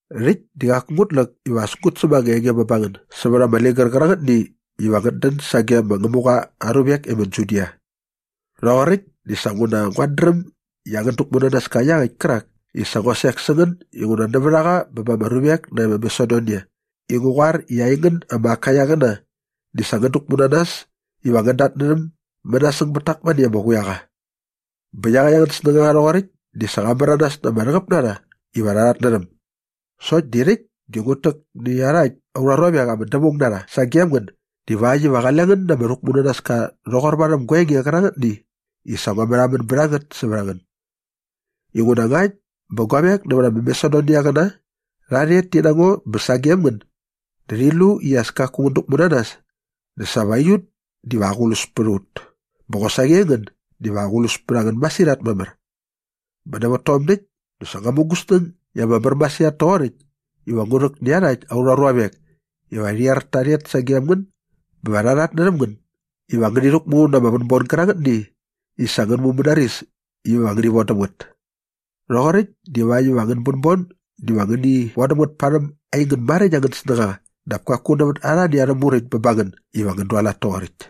Rhäkt di qaku ngut läk iva as ngut säm ama enge bä ba ngän sävät ama ligär qärangätni iva ngät dän sage ma Ngämuqa aa ruvek e ma Judia. Rhoqoräkt dinguna sa nguat dräm i angän däkmunanaska iaqäkt kärak i sa ngua sek sä ngän inguna nävät a qa bä ba ama ruvek nae ma Masedonia i ngu qoar i aingän ama Akaiaqäna di sa ngän däkmu na nas iva ngän datnärhäm mänasäng bät tak mane ama quiaqa. Bä iaqäkt angän snängaqa rhoqoräkt di sa qa märanas na ama rhäqäp na rha iva rha rhatnärhäm. Sokt di rhäkt di ngut täk nä iarhakt aurha ruavek ama dävaung na rha sagem ngän divakt iva qale ngän na ama rhäkmunanaska rhoqor varhäm gua enge qärangätni i sa ngua märhamän bät a ngät sävät a ngän. Inguna ngakt bä guavek nävät ama Masedoniaqäna rha rhet ti na ngo bä sagem ngän dä rhi lu i as kaku ngän däkmu na nas dä sa va aiut diva aqlus pät a ut bä qosaqi aingän diva aqlus pät a ngän masirhat mamär. Bä nävät tom däkt dä sa ngua mu gu snäng i ama mär masirhat toqoräkt iva ngu rhäk nä iarhakt aurha ruavek iva rhi er ta rhet sagem ngän bä va rha rhatnärhäm ngän iva ngäni rhäkmu na ama vänbon gärangätni i sa ngän mumänaris iva ngäni von däm ngät. Rhoqoräkt divakt iva angän bänbon diva ngäni vodäm ngät parhäm aingän maräkt angän snängaqa dap kaku nävät arhani arhä muräkt bä ba ngän iva ngän dualat toqoräkt.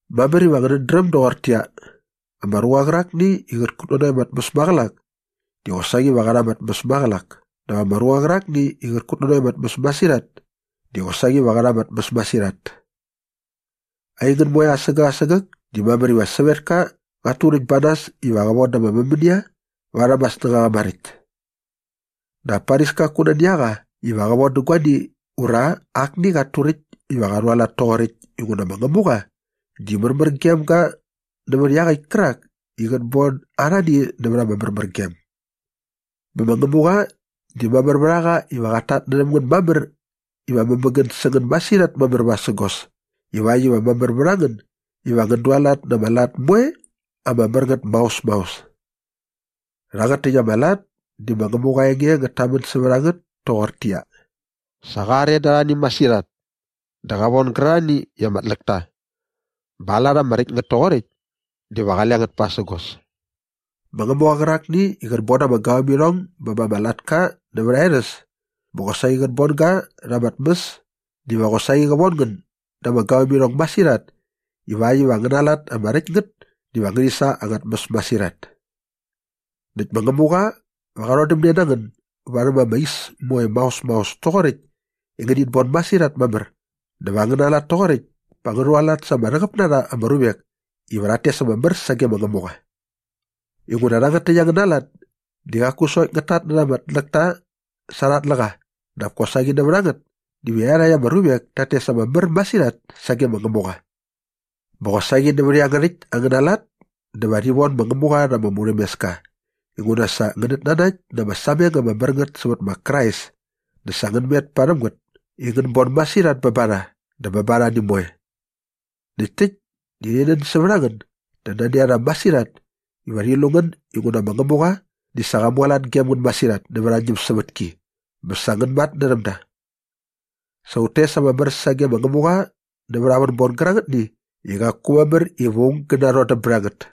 Mamär iva ngänät dräm doqortäqyia, ama ruqa qärakni i qät kutnanokt ama tmäs maqälak di qosaqi va qä rha ama tmäs maqälak dap ama ruqa qärakni i qät kutnanokt ama tmäs masirhat di qosaqi va qä rha ama tmäs masirhat. Aingän moe asägäk asägäk di mamär iva sävetka qat turäkt ba nas iva qä von da ama mämänia varhäm aa snängaqa maräkt. Dap paris kaku nani a qa iva qä von dä guani ura akni qat turäkt iva qa rhualat toqoräkt inguna ma Ngämuqa di märmär gem ga nävät iaqäkt kärak i qät bon arhani nävät ama märmärgem. Bä ma Ngämuqa di mamär vät a qa iva qat tatnärhäm ngän mamär iva mämägän sä ngän masirhat mamär vasägos ivakt iva mamär vät a ngän iva ngän dualat na ama lat moe ama mär ngät maos maos. Rhangät täkt ama lat di ma Ngämuqa aa enge ngät tamän sävät a ngät toqortäqyia, “Sa qa are da arhani masirhat dä qa von gärarhani i ama tläk ta bä aa lat ama räkt ngät toqoräkt diva qale ngät pasägos.” Ma Ngämuqa qärakni i qät bon da ama gavämirhong bä ba ama latka nävät aa erhäs bä qosaqi qät bon ga rha ama tmäs diva qosaqi qä von ngän da ama gavämirhong masirhat ivakt iva angäna lat ama räkt ngät diva ngärhi sa ama tmäs masirhat. Näkt ma Ngämuqa va qa rhodämne na ngän nä varhäm ama is moe maos maos toqoräkt i ngänit bon masirhat mamär dä va angäna lat toqoräkt pa ngä rhualat sa ama rhäqäp na rha ama ruvek iva rhat tes ama mär sage ma Ngämuqa. Inguna rhangät täkt angäna lat di qaku sokt ngät tatnärha ama tläkta sa arha tläqa dap kosaqi nävät a ngät diva iarhakt ama ruvek tat tes ama mär masirhat sage ma Ngämuqa. Bä qosaqi nävät iangärhäkt angäna lat dä va rhi von ma Ngämuqa rha ama murhämeska inguna sa ngänät nanakt na ama sameng ama mär ngät sävät ma Krais dä sa ngän met parhäm ngät i ngän bon masirhat bä ba rha dä bä ba arhani moe. Näkt täkt di rhi nän sävät a ngän dä nani a rha masirhat iva rhi lu ngän inguna ma Ngämuqa di sa qa mualat gem ngän masirhat nävät aa ñämsävätki bä sa ngän matnärhäm da. Sa ut tes ama mär sage ma Ngämuqa nävät aa vänbon gärangätni i qaku mamär iva aung gä narhodäm bät a ngät.